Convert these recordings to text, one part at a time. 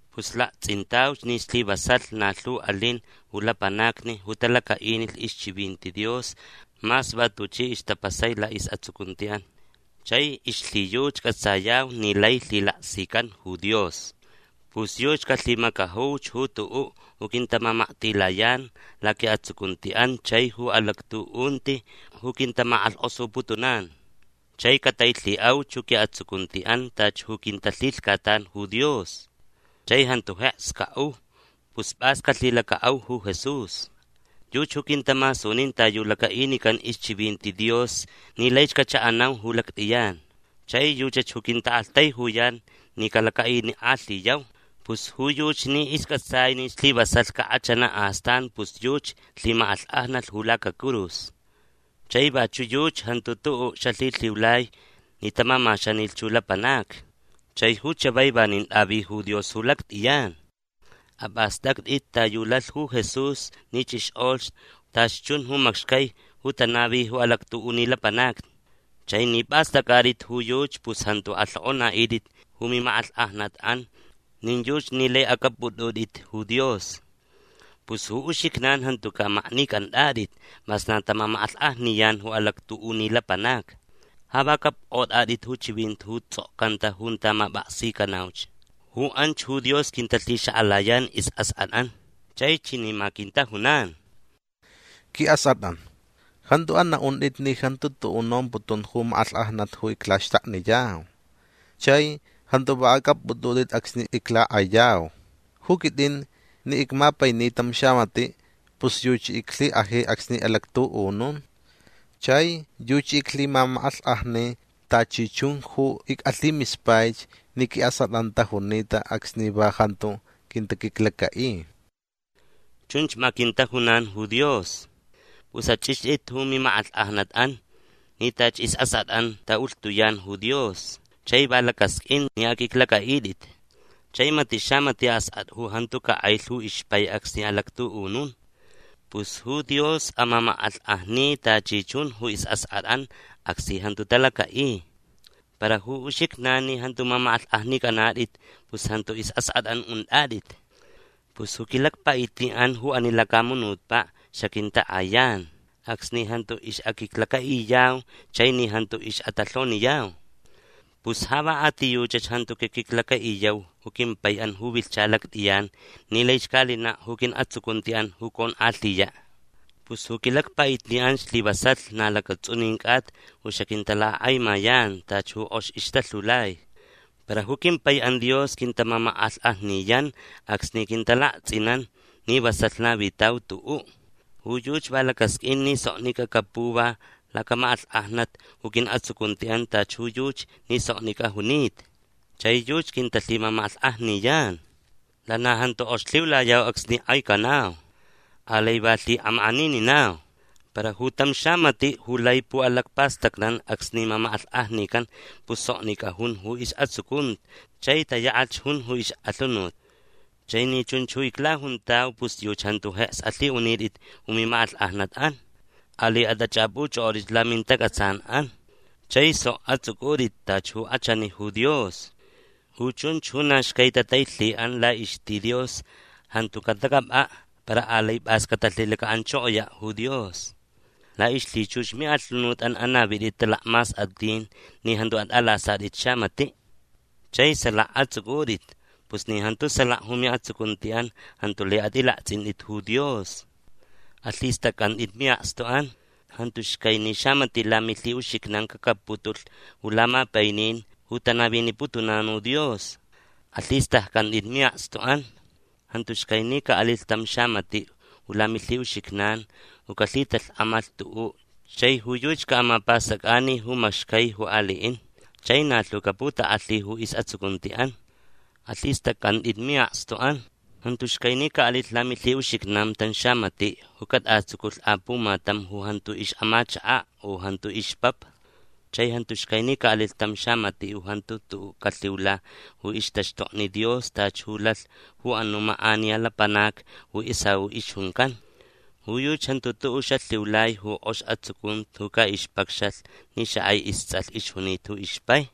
Pus lakts'intauch ni slivasalh na lhu alin ju lapanacni ju talaca'inilh ixchivinti Dios mas va tuchi ixtapasai la'is'atsucunti'an. Chai ixlhiyuchi c'atsayau ni lai lhilaksican ju Dios. Pus yuchi calhimacajuch ju tu'u' ju quintamamaktilayan laqui'atsucunti'an chai ju alactu'unti ju quintamak'alhk'osuputunan. Chai catailhi'auch ju qui'atsucunti'an tachi ju quintalhilhcatan ju Dios. Chai jantu jeks ca'u. Pus p'as calhilaca'au ju Jesús. Yuchi ju quintamasunin ta yu laca'inican ixchivinti Dios ni laich cacha'anau ju lact'iyan. Chai yuchach ju quinta'aktaijuyan ni calaca'inik'alhiyau. Pus ju yuchi ni isc'atsai ni slivasalh cak'achana' astan pus yuchi lhimak'alhk'ajnalh ju lacacurus. Chai vachu' yuchi jantu tu'u' xalhilhiulai ni tamamaxanilh ju lapanacni. Chai ju chavai vanin t'avi ju Dios ju lact'iyan. Ap'ast'act'it ta yu lalh ju Jesús ni ch'ixk'olh tachi chun ju macxcai ju tanavi ju alactu'uni lapanacni. Chai ni p'ast'ac'at'it ju yuchi pus jantu alhok'ona'it'it ju mimak'alhk'ajnat'an nin yuchi ni lai ac'app'ut'ut'it ju Dios. Pus ju uxijnan jantuca' maknic'ant'at'it mas na tamamak'alhk'ajniyan ju alactu'uni lapanacni. Ja va c'apk'ot'at'it ju chivinti ju ts'okcanta junta map'aksicanauch. Ju anch ju Dios quintalhixak'alayan is'ask'at'an. Chai chani ma quintajunan: Qui'ask'at'an jantu ana'unt'it ni jantu tu'u' nomputun ju mak'alhk'ajnat ju iclaxtakniyau. Chai jantu va ac'app'ut'ut'it acsni iclak'ayau. Ju quit'in ni icmapaini tam xamati' pus yuchi iclhik'aji acsni alactu'unun. Chai yuchi ic'alhimamak'alhk'ajni tachi chun ju ic'alhimispaich ni qui'ask'at'an tajunita acsni va jantu quintaquiclaca'i. Chunch ma quintajunan ju Dios. Pus ach'ixt'itch ju mimak'alhk'ajnat'an ni tachi is'ask'at'an ta'ulhtuyan ju Dios chai va lacasq'uin ni aq'uiclac'a'it'it. Chai mati' xamati' ask'at'a ju jantu cak'ailh ju ixpai acsni alactu'unun. Pus ju Dios amamak'alhk'ajni tachi chunch ju is'ask'at'an acsni jantu talaca'i. Para ju uxijnan ni jantu mamak'alhk'ajnic'anat'it pus jantu is'ask'at'an unt'at'it. Pus ju quilacpa'itni'an ju ani lacamunutpa' xaquintak'ayan acsni jantu ix'aquiclaca'iyau chai ni jantu ix'atalhoniyau. Pus ja va a ti yuchach jantu caquiclaca'iyau ju quimpai'an ju vilhcha lact'iyan ni laich ca'alina' ju qui'atsucunti'an ju conk'alhiya'. Pus ju quilacpa'itni'an slivasalh na lacats'unin c'ata ju xaquintalacak'aimayan tachi ju k'ox ixtalhiulai. Para ju quimpai'an Dios quintamamak'alhk'ajniyan acsni quintalakts'inan ni vasalh navitau tu'u'. Ju yuchi va lacasq'uin ni soknic'a capuva lacamak'alhk'ajnat ju qui'atsucunti'an tachi ju yuchi ni soknic'a junita. Chai yuchi quintalhimamak'alhk'ajniyan. Lana jantu k'ox lhiulayau acsni k'aicanau. Alai va lhi'amak'anininau. Para ju tam xamati' ju lai pu'alacpastacnan acsni mamak'alhk'ajnican pus soknic'a jun ju is'atsucunti chai tayak'ach jun ju ix'alhunut. Chai ni chunch ju iclajuntau pus yuchi jantu jeks alhi'unit'it ju mimak'alhk'ajnat'an. Alai at'ach'ap'uch'ok'ot'itch lamintac'atsan'an. Chai sok ats'uc'ut'it tachi ju k'achani ju Dios. Ju chunch ju na xcai tatailhi'an la'ixti Dios jantu catac'ap'a' para alai p'as catalhilaca'anchokoya' ju Dios. La'ixlhichux mi'alhunut'an anavit'it talakmask'at'in ni jantu at'alasat'it xamati'. Chai salaka ats'uc'ut'it. Pus ni jantu salaka ju mi'atsucunti'an jantu lai at'ilakts'int'it ju Dios. Alhist'acc'ant'it mi'akstu'an. Jantu xcai ni xamati' lamilhi'uxijnan cacapputulh ju lamapainin ju tanaviniputunan ju Dios. Alhist'acc'ant'it mi'akstu'an. Jantu xcai ni ca'alilh tam xamati' ju lamilhi'uxijnan ju calhitalhk'amalh tu'u' chai ju yuchi ca'amapast'ac'ani ju amacxcai ju ali'in chai na lhu caputak'alhi ju is'atsucunti'an. Alhist'acc'ant'it mi'akstu'an. Jantu xcai ni ca'alilh lamilhi'uxijnan tam xamati' ju cat'atsuculh apumatam ju jantu ix'amachaka' u ju jantu ixpapa. Chai jantu xcai ni ca'alilh tam xamati' ju jantu tu'u' calhiula ju ixtaxtokni Dios tachi ju lalh ju anu' mak'aniya lapanac ju Esaú ixjuncan. Ju yuchi jantu tu'u' xalhiulai ju k'ox atsucunti ju ca'ixpacxalh ni xak'ai ists'alh ixjunita ju ixpai.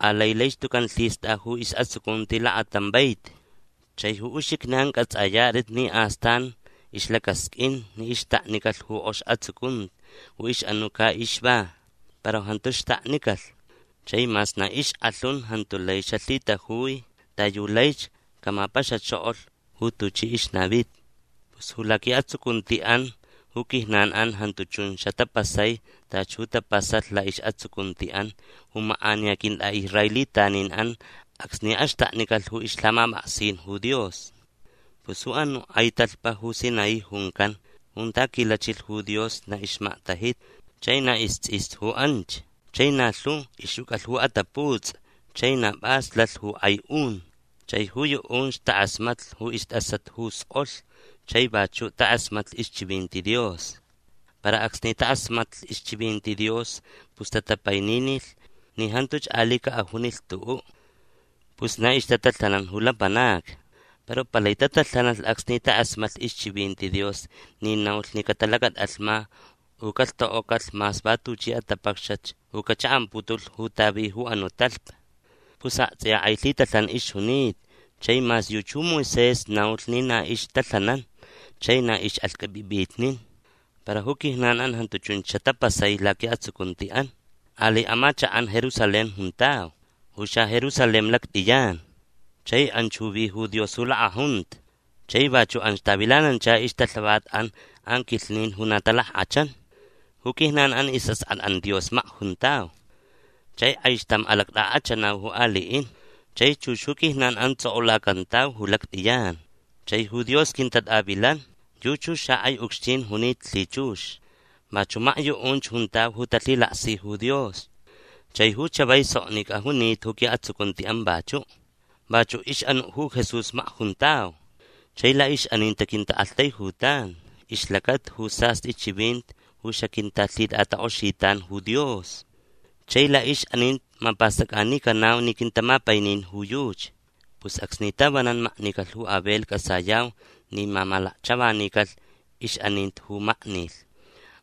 Alai laich tucan lhist'a ju is'atsucunti lakatam vaiti. Chai ju uxijnan c'ats'ayat'it ni astan ixlacasq'uin ni ixtaknicalh ju k'ox atsucunti ju ix'anu' ca'ixva para jantu xtaknicalh. Chai mas na ixk'alhun jantu lai xalhitajui ta yu laich camapaxachokolh ju tuchi ixnavita. Pus ju laqui'atsucunti'an ju quijnan'an jantu chun xatapasai tachi ju tapasalh la'is'atsucunti'an ju mak'aniya quint'a'israelitanin'an acsni axtaknicalh ju ixlhamap'aksin ju Dios. Pus ju anu' k'ai talhpa ju Sinaí juncan junta quilachilh ju Dios na ixmaktajita chai na ists'ista ju anch chai na lhu ixjuc'alh ju ataputs'i chai na p'as lalh ju k'ai un. Chai ju yu'unch tak'asmatlh ju ist'asat ju sk'olh chai vachu' tak'asmatlh ixchivinti Dios. Para acsni tak'asmatlh ixchivinti Dios pus tatapaininilh ni jantuch ali' ca'ajunilh tu'u'. Pus na ixtatalhanan ju lapanacni. Para palai tatalhanalh acsni tak'asmatlh ixchivinti Dios ni naulh ni catalacat'alhma u calhtok'ocalh mas va tuchi atapacxat ju cacha'amputulh junta vi ju anu' talhpa. Pus akts'iya k'ai lhitalhan ixjunita chai mas yuchi ju Moisés naulh ni na ixtalhanan chai na ix'axq'uip'ip'itnin. Para ju quijnan'an jantu chunch xatapasai laqui'atsucunti'an. Alai amachak'an Jerusalén juntau. Ju xaJerusalén lact'iyan. Chai anchach ju vi ju Dios ju lak'ajunta. Chai vachu' anch tavilanancha ixtalhavat'an anquilhnin ju na talack'achan. Ju quijnan'an is'ask'at'an Dios makjuntau. Chai k'aixtam alact'ak'achanau ju ali'in. Chai chux ju quijnan'an ts'ok'ulacantau ju lact'iyan. Chai ju Dios quintat'avilan. Yuchach ju xak'ai ucxtin junita lhichux. Vachu' makyu'unch juntau ju talhilaksi ju Dios. Chai ju chavai soknic'a junita ju qui'atsucunti'an vachu'. Vachu' ix'anu' ju Jesús makjuntau. Chai la'ix'aninti quinta'aktaijutan ixlacata ju sast'i chivinti ju xaquintalhit'atak'oxitan ju Dios. Chai la'ix'aninti mapast'ac'anicanau ni quintamapainin ju yuchi. Pus acsni tavanan maknicalh ju Abel c'atsayau ni mamalakchavanicalh ix'aninti ju maknilh.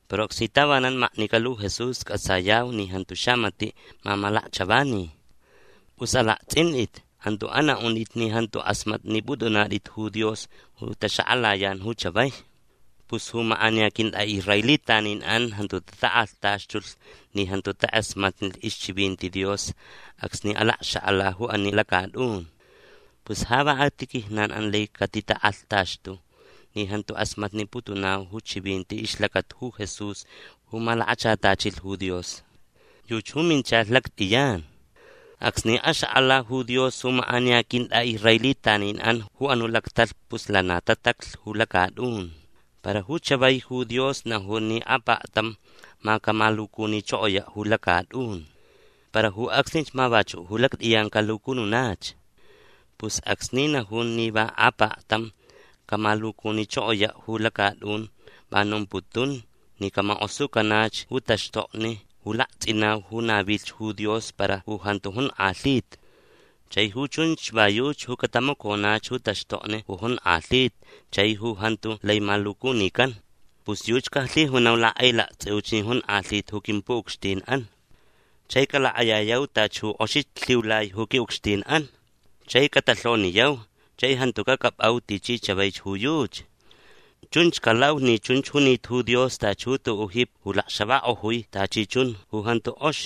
Para acsni tavanan maknicalh ju Jesús c'atsayau ni jantu xamati' mamalakchavani. Pus alakts'int'it. Jantu ana'unt'it ni jantu k'asmatnip'ut'unat'it ju Dios ju taxak'alayan ju chavai. Pus ju mak'aniya quint'a'israelitanin'an jantu tatak'alhtaxtulh ni jantu tak'asmatnilh ixchivinti Dios acsni alacxak'ala ju ani lacat'un. Pus ja va a ti quijnan'an lai catitak'alhtaxtu ni jantu k'asmatniputunau ju chivinti ixlacata ju Jesús ju malakachatachilh ju Dios. Yuchi ju minchalh lact'iyan. Acsni axak'ala ju Dios ju mak'aniya quint'a'israelitanin'an ju anu' lactalhpa pus lana tataclh ju lacat'un. Para ju chavai ju Dios najun ni apaktam ma camalucunichokoya' ju lacat'un. Para ju acsnich ma vachu' ju lact'iyan calucununach. Pus acsni najun ni va apaktam camalucunichokoya' ju lacat'un va nomputun ni camak'osucanach ju taxtokni ju lakts'inau ju navilh ju Dios para ju jantu jonk'alhita. Chai ju chunch va yuchi ju catamaconach ju taxtokni ju jonk'alhita chai ju jantu lai malucunican. Pus yuchi calhijunau lak'ailakts'iuch ni jonk'alhita ju quimpu'ucxtin'an. Chai calak'ayayau tachi ju k'oxich lhiulai ju qui'ucxtin'an. Chai catalhoniyau chai jantu cac'ap'au tichi chavaich ju yuchi. Chunch calau ni chunch junita ju Dios tachi ju tu'u' jipi ju lacxavak'ojui tachi chun ju jantu k'ox.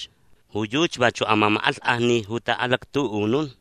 Ju yuchi vachu' amamak'alhk'ajni ju ta'alactu'unun.